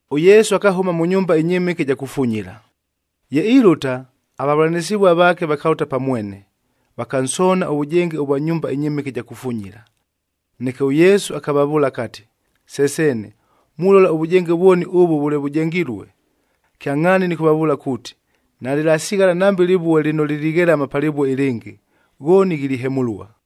ɄYesu akahʉma mʉ nyumba ɨnyɨmɨke ɨja kufunyila. Ye ilʉta, avavʉlanɨsɨvua vaake vakalʉta pa mwene, vakansoona ʉvʉjenge ʉvwa nyumba ɨnyɨmɨke ɨja kufunyila. Neke ʉYesu akavavʉʉla akati, “Se seene, mulola ʉvʉjenge vwoni ʉvʉ vʉle vʉjengilue! Kyangʼhaani nɨkʉvavʉʉla kuuti, nalɨlasighala nambe lɨvue lɨno lilighelama pa lɨvue ɨlɨngɨ, ghooni ghilihemʉlua.”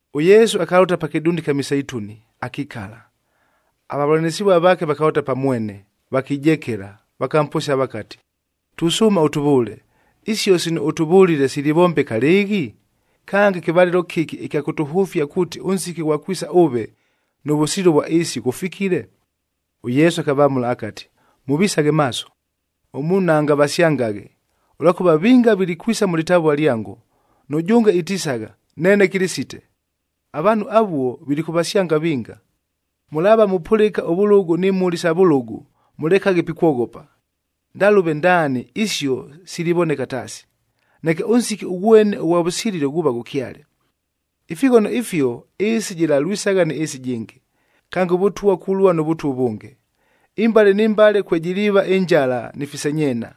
ɄYesu akalʉta pa kɨdunda ɨkya Miseituni, akikala. Avavʉlanɨsɨvua vaake vakalʉta pa mwene, vakijekela, vakamposia vakati, “Tusʉʉma ʉtʉvʉʉle, isio sino ʉtʉvʉlile silivombeka lɨɨghi? Kange, kɨvalɨlo kɨki ɨkya kʉtʉhʉfia kuuti ʉnsiki ʉghwa kwisa ʉve, nʉ vʉsililo vwa ɨɨsi, ghʉfikile?” ɄYesu akavamʉla akati, “Mʉvisaghe maaso, ʉmuunhu naangavasyangaghe! Ʉlwakʉva vinga vilikwisa mʉ lɨtavua lyango, nʉjʉnge itisagha, ‘Neene Kɨlɨsite.’ Avaanhu avuo vilikʉvasyanga vinga. Mʉlaava mupʉlɨka ʉvʉlʉgʉ ni mhʉli isa vʉlʉgʉ, mʉlekaghe pikwoghopa. Ndalʉve ndaani isio silivoneka taasi, neke ʉnsiki ʉghwene ʉghwa vʉsililo ghuuva ghʉkyale.” Ifighono ifio ɨɨsi jɨlalwisagha nɨ ɨɨsi ɨjɨngɨ, kange ʉvʉtwa kulua nʉ vʉtwa ʉvʉnge. Imbale ni mbale kwejiliiva ɨnjala ni fisenyeena.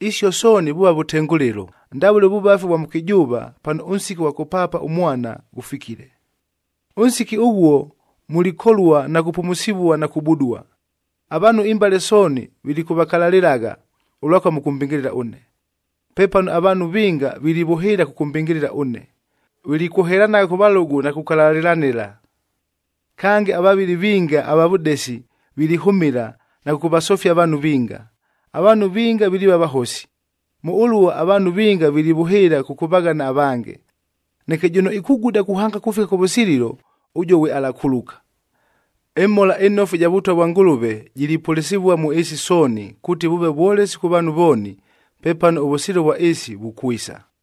Isio sooni vuuva vʉtengʉlɨlo, ndavʉle ʉvʉvafi ʉvwa mʉkɨjʉʉva, pano ʉnsiki ʉghwa kʉpaapa ʉmwana ghʉfikile. “Ʉnsiki ʉghuo, mulikolua na kupumusivua na kubudua. Avaanhu imbale sooni vilikʉvakalalɨlagha, ʉlwakʉva mʉkʉmbɨngɨlɨla ʉne. Pepano avaanhu vinga vilivʉhɨɨla kʉkʉmbɨngɨlɨla ʉne. Vilikwohelanagha kʉ valʉgʉ na kukalalɨlanɨla. Kange, avavɨli vinga ava vʉdesi vilihʉmɨla na kʉkʉvasofia avaanhu vinga. Avaanhu vinga viliiva vahosi. Mʉ ʉluo avaanhu vinga vilivʉhɨɨla kʉkʉvaghana avange. Neke jʉno ikuguda kuhanga kufika kʉvʉsililo, ʉjuo ghwe alakuluka. ƗMhola ɨNofu ɨja Vʉtwa vwa Ngʉlʉve jilipʉlɨsɨvua mʉ ɨɨsi sooni, kuuti vʉʉve vwolesi kʉ vaanhu vooni, pepano ʉvʉsililo vwa ɨɨsi vukwisa.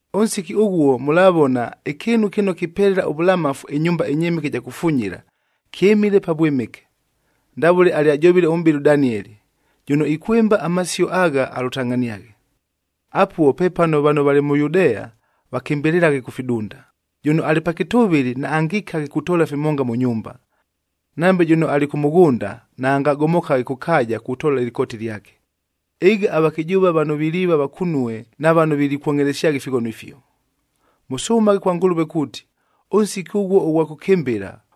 “Ʉnsiki ʉghuo mʉlavona ‘Ɨkɨɨnu kɨno kipelela ʉvʉlamafu’ ɨnyumba ɨnyɨmɨke ɨja kufunyila, kyɨmile Pavwɨmɨke, ndavʉle alyajovile ʉmʼbɨli ʉDanieli.a Jʉno ikwɨmba amasio agha alʉtangʼhaniaghe. Apuo pepano vano valɨ mʉ Yudea, vakɨmbɨlɨlaghe kʉ fidunda, jʉno alɨ pa kɨtʉvɨlɨ, naangikaghe kutoola fimonga mʉ nyumba. Nambe jʉno alɨ kʉ mʉghʉnda, naangagomokaghe kʉ kaaja kutoola ɨlɨkooti lyake. Ɨga avakɨjʉʉva vano viliiva vakunue na vano vilikwongʼhelesyagha ifighono ifio! Mʉsʉmaghe kwa Ngʉlʉve kuuti, ʉnsiki ʉghuo ʉghwa kʉkɨmbɨla,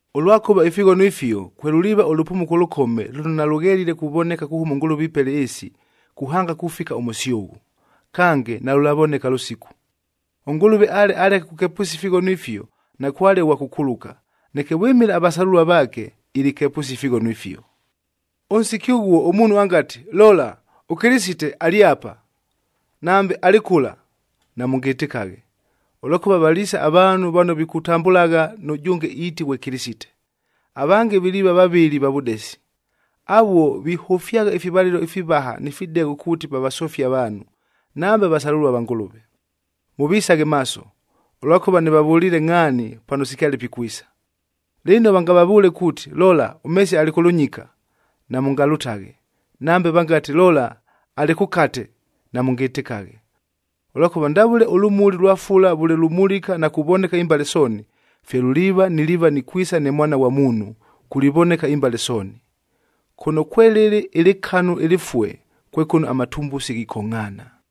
Ʉlwakʉva ifighono ifio, kwelʉliiva ʉlʉpumuko ʉlʉkome lʉno nalʉghelile kuvoneka kuhʉma ʉNgʉlʉve ipela ɨɨsi, kuhanga kufika ʉmʉsyʉghʉ. Kange, nalʉlavoneka lʉsiku. ɄNgʉlʉve ale aleke kukepʉsia ifighono ifio, nakwale ʉghwa kʉkuluka. Neke vwɨmɨla avasalʉlua vaake, ilikepʉsia ifighono ifio. “Ʉnsiki ʉghuo, ʉmuunhu angati, ‘Lola, ʉKɨlɨsite alɨ apa,’ nambe, ‘Alɨ kʉla,’ namʉngɨtɨkaghe. Ʉlwakʉva valiisa avaanhu vano vikutambʉlagha nʉjʉnge iiti ghwe ‘Kɨlɨsite,’ avange viliiva vavɨli va vʉdesi. Avuo vihʉfyagha ifivalɨlo ifivaha ni fidegho kuuti vavasofie avaanhu, nambe avasalʉlua va Ngʉlʉve. Mʉvisaghe maaso, ʉlwakʉva nɨvavʉliile ngʼhaani pano sikyale pikwisa. Lɨno vangavavʉʉle kuuti, ‘Lola, ʉMesiya alɨ kʉ lʉnyika,’ namʉngalʉtaghe. Nambe vangati, ‘Lola, alɨ kʉkate,’ namʉngɨtɨkaghe. Ʉlwakʉva ndavʉle ʉlʉmuli lwa fula vʉle lumulika na kuvoneka imbale sooni, fye luliiva niliiva nikwisa ne Mwana ghwa Muunhu, kulivoneka imbale sooni. Kʉno kwelɨlɨ ɨlɨkanu ɨlɨfue kwe kʉno amatumbusi ghikongʼhaana.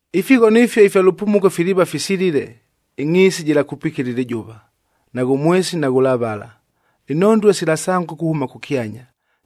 “Ifighono ifio ifya lʉpumuko filiiva fisilile, ‘ɨngʼhiisi jɨlakupikila ɨlɨjʉva, naghʉ mwesi naghʉlavala, inhondue silasangʉka kuhʉma kʉkyanya,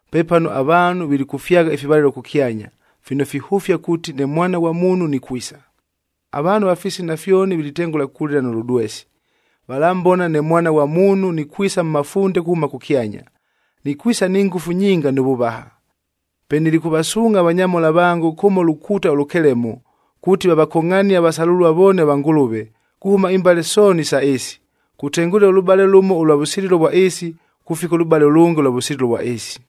“Pepano avaanhu vilikʉfyagha ifivalɨlo kʉkyanya, fino fihʉfia kuuti ne Mwana ghwa Muunhu nikwisa. Avaanhu ava fisina fyoni vilitengʉla kulɨla nʉ lʉdwesi. Valambona ne Mwana ghwa Muunhu nikwisa mʉ mafunde kuhʉma kʉkyanya.d Nikwisa ni ngʉfu nyinga nʉ vʉvaha. Pe nilikʉvasuungʼha avanyamhola vango kʉmo lukuuta ʉlʉkelemo, kuuti vavakongʼhanie avasalʉlua vooni ava Ngʉlʉve kuhʉma imbale sooni isa ɨɨsi, kutengʉlɨla ʉlʉbale lʉmo ʉlwa vʉsililo vwa ɨɨsi, kufika ʉlʉbale ʉlʉnge ʉlwa vʉsililo vwa ɨɨsi.”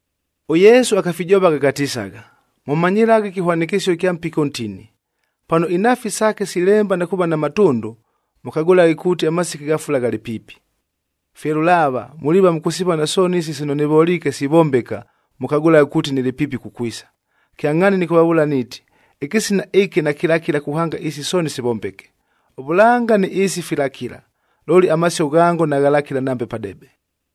ɄYesu akafijovagha akatisagha, “Mʉmanyɨlaghe ɨkɨhwanɨkɨsio ɨkya mpiki ʉntini. Pano inhaafi saake silemba na kuuva na matʉndʉ, mʉkagʉlaghe kuuti amasiki gha fula ghalɨ piipi. Fye lʉlaava, muliiva mʉkʉsivona sooni isi sino nɨvoliike sivombeka, mʉkagʉlaghe kuuti nɨlɨ piipi kukwisa. Kyangʼhaani nɨkʉvavʉʉla niiti, ɨkɨsina ɨkɨ nakɨlakila kuhanga isi sooni sivombeke. Ʉvʉlanga nɨ ɨɨsi filakila, looli amasio ghango naghalakila nambe padebe.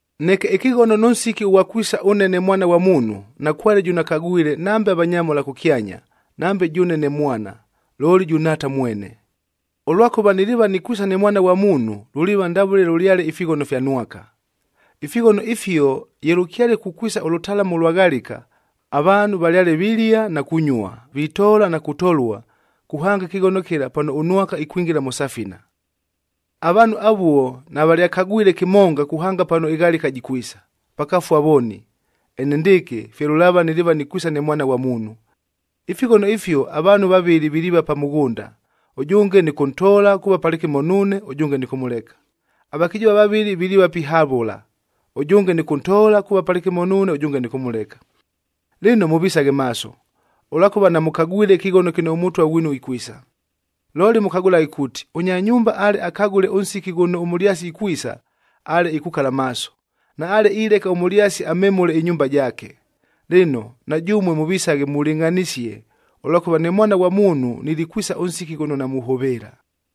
“Neke ɨkɨghono nʉ nsiki ʉghwa kwisa ʉne ne Mwana ghwa Muunhu, nakwale jʉno akagwile nambe avanyamhola kʉkyanya, nambe jʉʉne ne Mwana, looli jʉ Nhaata mwene. Ʉlwakʉva niliiva nikwisa ne Mwana ghwa Muunhu luliiva ndavʉle lʉlyale ifighono ifya Nwaka. Ifighono ifio ye lʉkyale kukwisa ʉlʉtalamu ʉlwa ghalika, avaanhu valyale vilia na kunyua, vitoola na kutolua kuhanga ɨkɨghono kɨla pano ʉNwaka ikwingila mʉ safina. Avaanhu avuo navalyakagwile kɨmonga kuhanga pano ɨghalika jikwisa, vakafua vooni. Enendɨɨkɨ fye lʉlaava niliiva nikwisa ne Mwana ghwa Muunhu. Ifighono ifio avaanhu vavɨlɨ viliiva pa mʉghʉnda, ʉjʉnge nɨkʉntoola kuuva palɨkɨmo nuune, ʉjʉnge nɨkʉmʉleka. Avakɨjʉʉva vavɨlɨ viliiva pihavʉla, ʉjʉnge nɨkʉntoola kuuva palɨkɨmo nuune, ʉjʉnge nɨkʉmʉleka. “Lɨno, mʉvisaghe maaso, ʉlwakʉva namʉkagwile ɨkɨghono kɨno ʉMʉtwa ghwinu ikwisa. Looli mʉkagʉlaghe kuuti, ʉnya nyumba ale akagʉle ʉnsiki ghʉno ʉmʉlyasi ikwisa, ale ikukala maaso, naale ileka ʉmʉlyasi amemʉle ɨnyumba jaake. Lɨno, na jʉmue mʉvisaghe mulɨngʼhanisie, ʉlwakʉva ne Mwana ghwa Muunhu nilikwisa ʉnsiki ghʉno namuhʉvɨɨla.”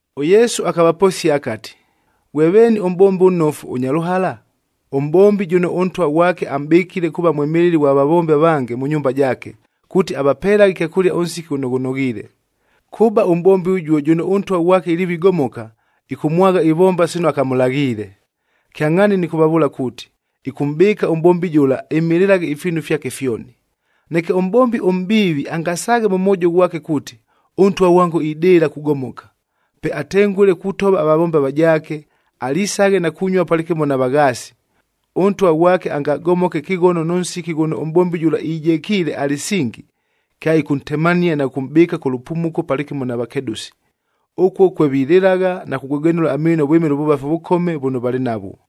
ɄYesu akavaposia akati, “Ghwe veeni ʉmʼbombi ʉnnofu, ʉnya lʉhala? Ʉmʼbombi jʉno ʉntwa ghwake amʼbɨkile kuuva mwɨmɨlɨli ghwa vavombi avange mʉ nyumba jaake, kuuti avapelaghe ɨkyakʉlia ʉnsiki ghʉno ghʉnoghiile. Kʉba ʉmʼbombi ʉjuo jʉno ʉntwa ghwake iliiva igomoka, ɨkʉmwagha ivomba sino akamʉlaghiile. Kyangʼhaani nɨkʉvavʉʉla kuuti, ɨkʉmʼbɨɨka ʉmʼbombi jʉla, ɨmɨlɨlaghe ifiinu fyake fyoni. Neke ʉmʼbombi ʉmʼbiivi angasaaghe mʉ mwojo ghwake kuuti, ‘Ʉntwa ghwango idɨɨla kugomoka.’ Pe atengʉle kutova avavombi avajaake, alisaghe na kunyua palɨkɨmo na vaghaasi, ʉntwa ghwake angagomoke ɨkɨghono nʉ nsiki ghʉno ʉmʼbombi jʉla ijekiile alɨsingi, kyaɨkʉntemania na kʉkʉmʼbɨɨka kʉ lʉpumuko palɨkɨmo na vakedʉsi. Ʉkuo kwe vililɨlagha na kugwegwenʉla amiino vwɨmɨla ʉvʉvafi ʉvʉkome vʉno valɨ navwo.”